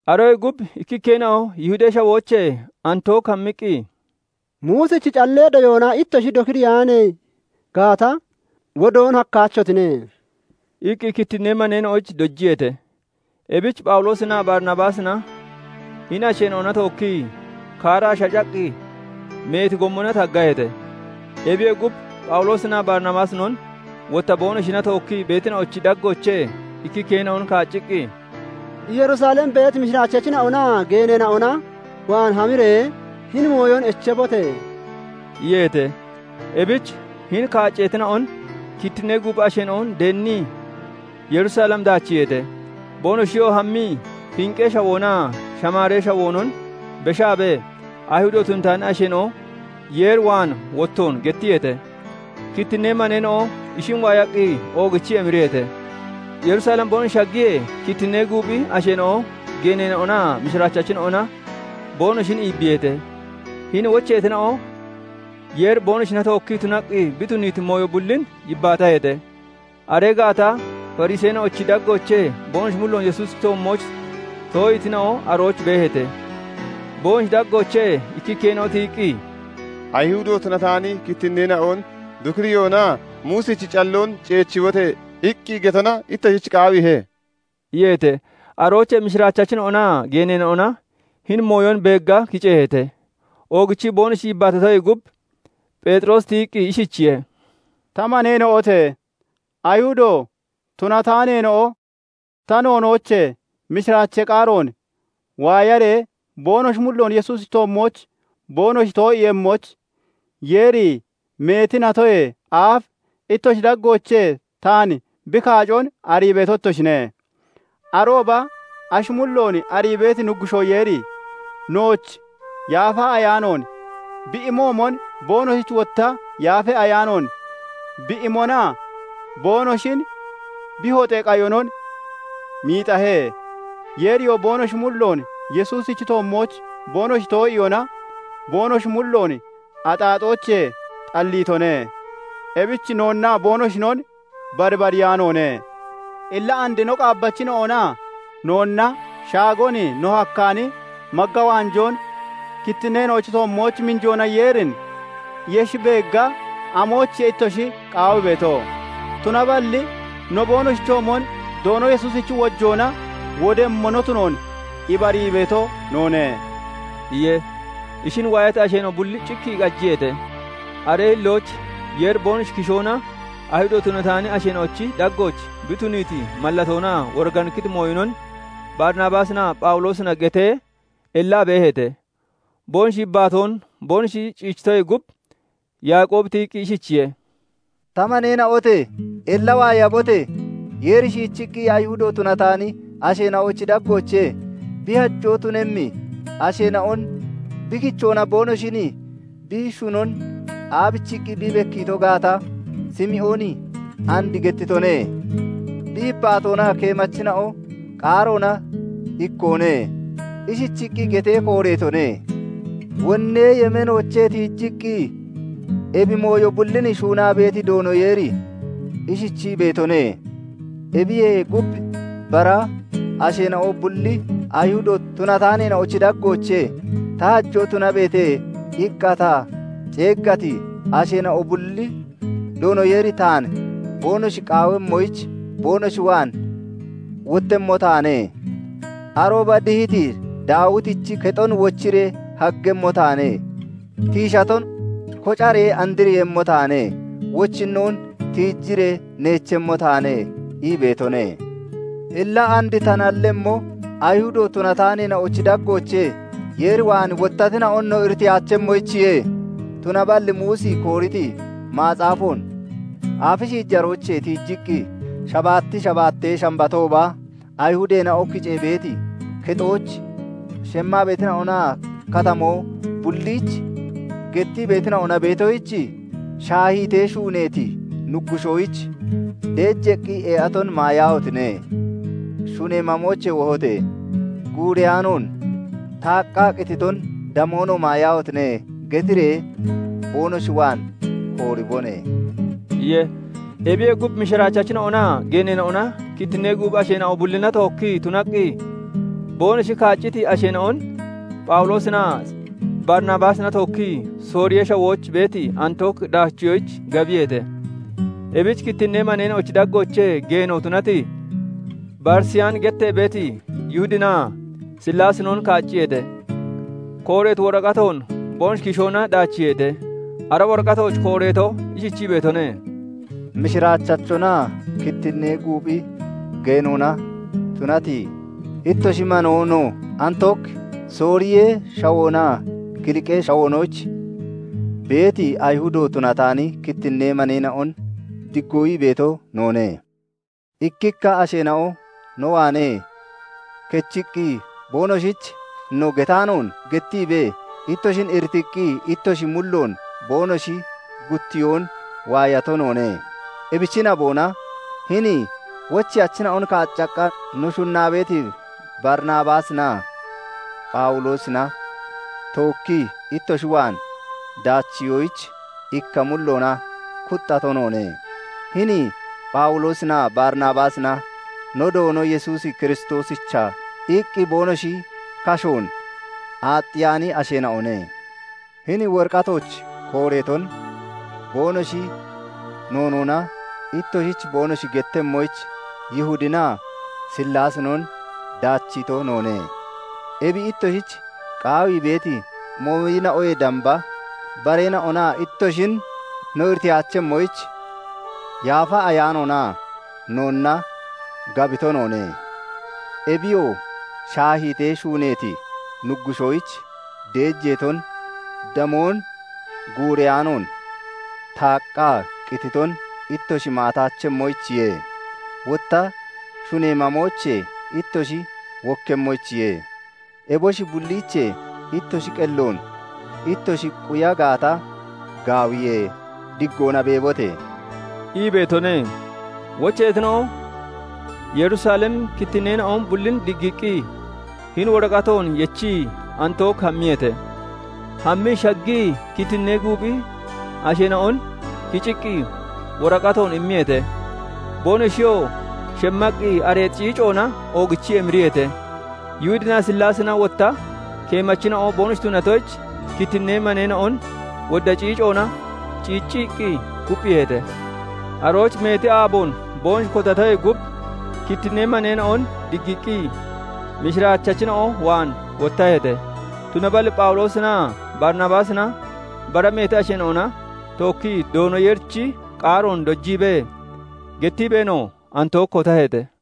Aroyee gub ikkikkeena'o Yihudee Shawoochee Antook hammiqqi, "Muusichi callee doyoona ittoshi dokiriyaani gaata, wodoon hakkaachotine" iqqi kittinnee maneena'oyich dojiyeete. Ebich Phawuloosinaa Barinabaasina hini asheena'ona tookkii kaaraa shacaqqi, meeti gommona taggaheete. Ebiyee gub, Phawuloosinaa Barinabaasinon, wotta boonoshina tookkii beetina'ochi daggoochee ikkikkeena'on kaacciqqi, "Yerusalem beeti mishiraachachina'onaa geeneena'ona waan hamiree hini mooyon echeebote!" iyeete. Ebich hini kaacceetina'on kittinnee guuphi asheena'o deennii Yerusalem daachiiheete. Boonoshiyoo hammii Finqee Shawoonaa Shamaaree Shawoonon beshaabee, Ayihudo tunataani asheena'o Yeer waan wottoon gettiyeete. Kittinnee maneena'o ishin waayaqqi oogichii emiriyeete. Yerusalem boonoshi shaggiyee, kittinnee guuphi asheena'o, geeneena'onaa mishiraachachina'ona boonoshin iibbiiheete. Hini wocheetina'o Yeeri boonoshina tookkii tunaqqi bi tuniiti mooyo bullin yibbaataheete. Aree gaata Fariseena'ochi daggoochee boonoshi mulloon Yesuusichi toommooch too'iitina'o arooch beeheete. Boonoshi daggoochee ikkikkeena'o tiyiqqi, "Ayihudo tunataani kittinneena'on dokiriyoonaa 'Muusichi calloon ceechibote!' iqqi getona ittoshich qaawiihe" iyeete. Aroochee mishiraachachina'onaa geeneena'ona hini mooyon beegga kiceeheete. Oogichii boonoshi yibbaatatoyee gub, Pheexiroosi tiyiqqi ishichiye:- "Ta maneena'ote! Ayihudo tunataaneena'o ta noonoochee mishiraachee qaaroon waayaree boonoshi mulloon Yesuusichi toommooch boonoshi too'iiyemmoyich, Yeeri meeti natoyee aaf ittoshi daggoochee taan bi kaacon arii beeto ittoshine. Arooba ashi mulloon arii beeti Nuggushoo Yeeri, nooch Yaafa Ayaanoon bi imoomon, boonoshich wotta Yaafa Ayaanoon bi imona boonoshin bi hoxee qayon miixahe; Yeeriyoo boonoshi mulloon Yesuusichi toommooch boonoshi too'iyoona boonoshi mulloon axaaxoochee xalliitone; ebich noonnaa boonoshinon barbariyaanoone. Illa and no qaabbachina'onaa noonna shaagon no hakkaani magga waanjoon kittinneena'ochi toommooch miinjoona Yeerin yeshi beegga amoyichiye ittoshi qaawii beeto? Tunaballi no boonoshichoomon Doono Yesuusichi wojoona wodemmo no tunoon ibarii beeto noone" iye. Ishin waayati asheena'o bulli cikkii qajiyeete. Aree hillooch Yeeri boonoshi kishoona Ayihudo tunataani asheena'ochi daggooch bi tuniiti mallatoonaa woriganikkiti mooyonon Barinabaasinaa Phawuloosina getee, ellaa beeheete. Boonoshi yibbaatoon boonoshi ciichitoyee gub, Yaaqoobi tiyiqqi ishichiye:- "Ta maneena'ote! Ella waayabote! Yeeri shiichiqqi Ayihudo tunataani asheena'ochi daggoochee bi hajoo tunemmi asheena'on bi kichoona boonoshin bi shunon aabichiqqi bi bekkiito gaata, Simooni and gettitone. Bi yibbaatoonaa keemachina'o qaaroona ikkoone; ishichiqqi getee kooreetone:- 'Wonnee yemeenoochee tiijiqqi, Ebi mooyo bullin shuunaa beeti Doono Yeeri ishichii beetone:- "Ebiyee gub, bara asheena'o bulli, Ayihudo tunataaneena'ochi daggoochee 'Ta hajoo tunabeete!' iqqa ta ceeggati asheena'o bulli Doono Yeeri taan boonoshi qaawemmoyich boonoshi waan wottemmo taane. Arooba dihiti Daawitichi kexon wochiree haggemmo taane; tiishaton kocaree andriiyemmo taane; wochinnoon tiijiree neechemmo taane" ii beetone.' "Illa and ta nallemmo, Ayihudo tunataaneena'ochi daggoochee Yeer waan wottatina'on no iritiyaachemmoyichiye. Tunaballi Muusi kooriti macaafoon aafi shiijaroochee tiijiqqi, shabaatti shabaattee Shambatooba Ayihudeena'o kicee beeti kexooch shemmaa beetina'onaa katamoo bulliich gettii beetina'ona beetoyich, 'Shaahiitee shuuneeti nuggushoyich deejeeqqi ee'aton maayaahotine! Shunee mamoochee wohote! Guureyaanoon taaqqaa qititon, damoonoo maayaahotine!' getiree boonoshi waan kooribone" iye. Ebiyee gub, mishiraachachina'onaa geeneena'ona kittinnee guuphi asheena'o bullina tookkii tunaqqi, boonoshi kaacciti asheena'on Phawuloosinaa Barinabaasina tookkii Sooriyee Shawooch beeti Antook daachiyoyich gabiyeete. Ebich kittinnee maneena'ochi daggoochee geeno tunati, Barisiyaani gettee beeti Yihudinaa Sillaasinon kaacciyeete. Kooreeti woraqatoon boonoshi kishoona daachiiheete; ara woraqatooch kooreeto ishichii beetone:- "Mishiraachachonaa kittinnee guuphi geenoona tunati ittoshi manoo no, Antook, Sooriyee Shawoonaa Kiliqee Shawoonooch beeti Ayihudo tunataani kittinnee maneena'on diggoo ii beeto noone. "Ikkikka asheena'o no waanee kechiqqi, boonoshich no getaanoon gettiibee ittoshin iritiiqqi ittoshi mulloon boonoshi guttiyoon waayato noone. Ebichi naboona hini wocheyachina'on kaaccaqqa no shunnaa beeti Barinabaasinaa Phawuloosina tookkii ittoshi waan daachiyoyich ikka mulloona kuxxato noone. Hini Phawuloosinaa Barinabaasina no Doono Yesuus Kiristoosicha iqqi boonoshi kashoon aaxxiyaani asheena'one. Hini woraqatooch kooreeton boonoshi noonoona ittoshich boonoshi gettemmoyich, Yihudinaa Sillaasinon daachiito noone. Ebi ittoshich qaawii beeti mooyina'oyee damba bareena'ona ittoshin no iritiyaachemmoyich, Yaafa Ayaanoonaa noonna gabito noone. Ebiyoo shaahiitee shuuneeti nuggushoyich deejeeton, damoon, guureyaanoon taaqqaa qititon ittoshi maataachemmoyichiye; wotta shunee mamoochee ittoshi wokkemmoyichiye. Eboshi bulliichee ittoshi qelloon ittoshi quya gaata, gaawiye. Diggona beebote!" ii beetone. Wocheyachina'o Yerusalemi kittinneena'o bullin diggiiqqi, hini woraqatoon yechii Antook hammiyeete. Hammii shaggii kittinnee guuphi asheena'on kiciqqi woraqatoon immiyeete. Boonoshiyoo shemmaqqi areexi ciicoona oogichii emiriyeete. Yihudinaa Sillaasina wotta keemachina'o boonoshi tunatoyich, kittinnee maneena'on wodda ciicoona ciicciqqi kupphiiheete. Arooch meeti aaboon boonoshi kotatoyee gub, kittinnee maneena'on diggiiqqi, mishiraachachina'o waan wottaheete. Tunaballi Phawuloosinaa Barinabaasina bara meeti asheena'ona tookkii Doono Yeerichi qaaroon dojiibee, gettiibeenoo Antook kotaheete.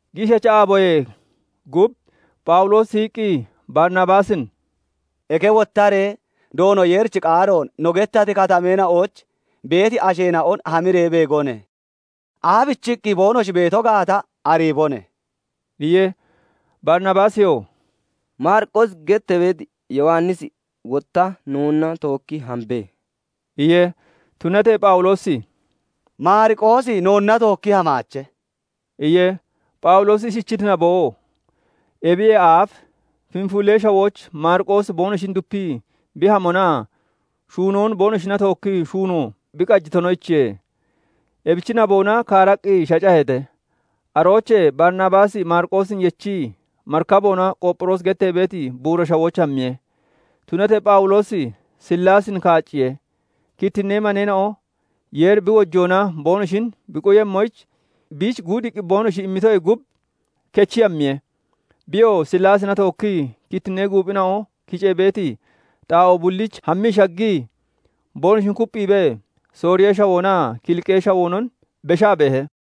Giishacha aaboyee gub Phawuloosi tiyiqqi Barinabaasin "Eke wottaree, Doono Yeerichi qaaroon no gettati katameena'ooch beeti asheena'on hamiree beegone! Aabichiqqi boonoshi beeto gaata ariibone!" iye. Barinabaasiyoo "Maariqoosi gettee beeti Yowannisi wotta noonna tookki hambe" iye. Tunatee Phawuloosi "Maariqoosi noonna tookki hamaache" iye. Phawuloosi ishichiti naboo, ebiyee aaf Fenfulee Shawooch Maariqoosi boonoshin dupii bi hamonaa shuunoon boonoshina tookkii shuunoon bi qajitonoyichiye. Ebichi naboona kaaraqqi shacaheete. Aroochee Barinabaasi Maariqoosin yechii marikaboona Qoopphiroosi gettee beeti buura shawooch hammiye. Tunatee Phawuloosi Sillaasin kaacciye; kittinnee maneena'o Yeeri bi wojoona boonoshin bi quyemmoyich biich guudiiqqi boonoshi immitoyee gub, kechii hammiye. Biyoo Sillaasina tookkii kittinnee guuphina'o kicee beeti xaa'oo bulliich hammii shaggii boonoshin kupphiibee, Sooriyee Shawoonaa Kiliqee Shawoonon beshaa beehe.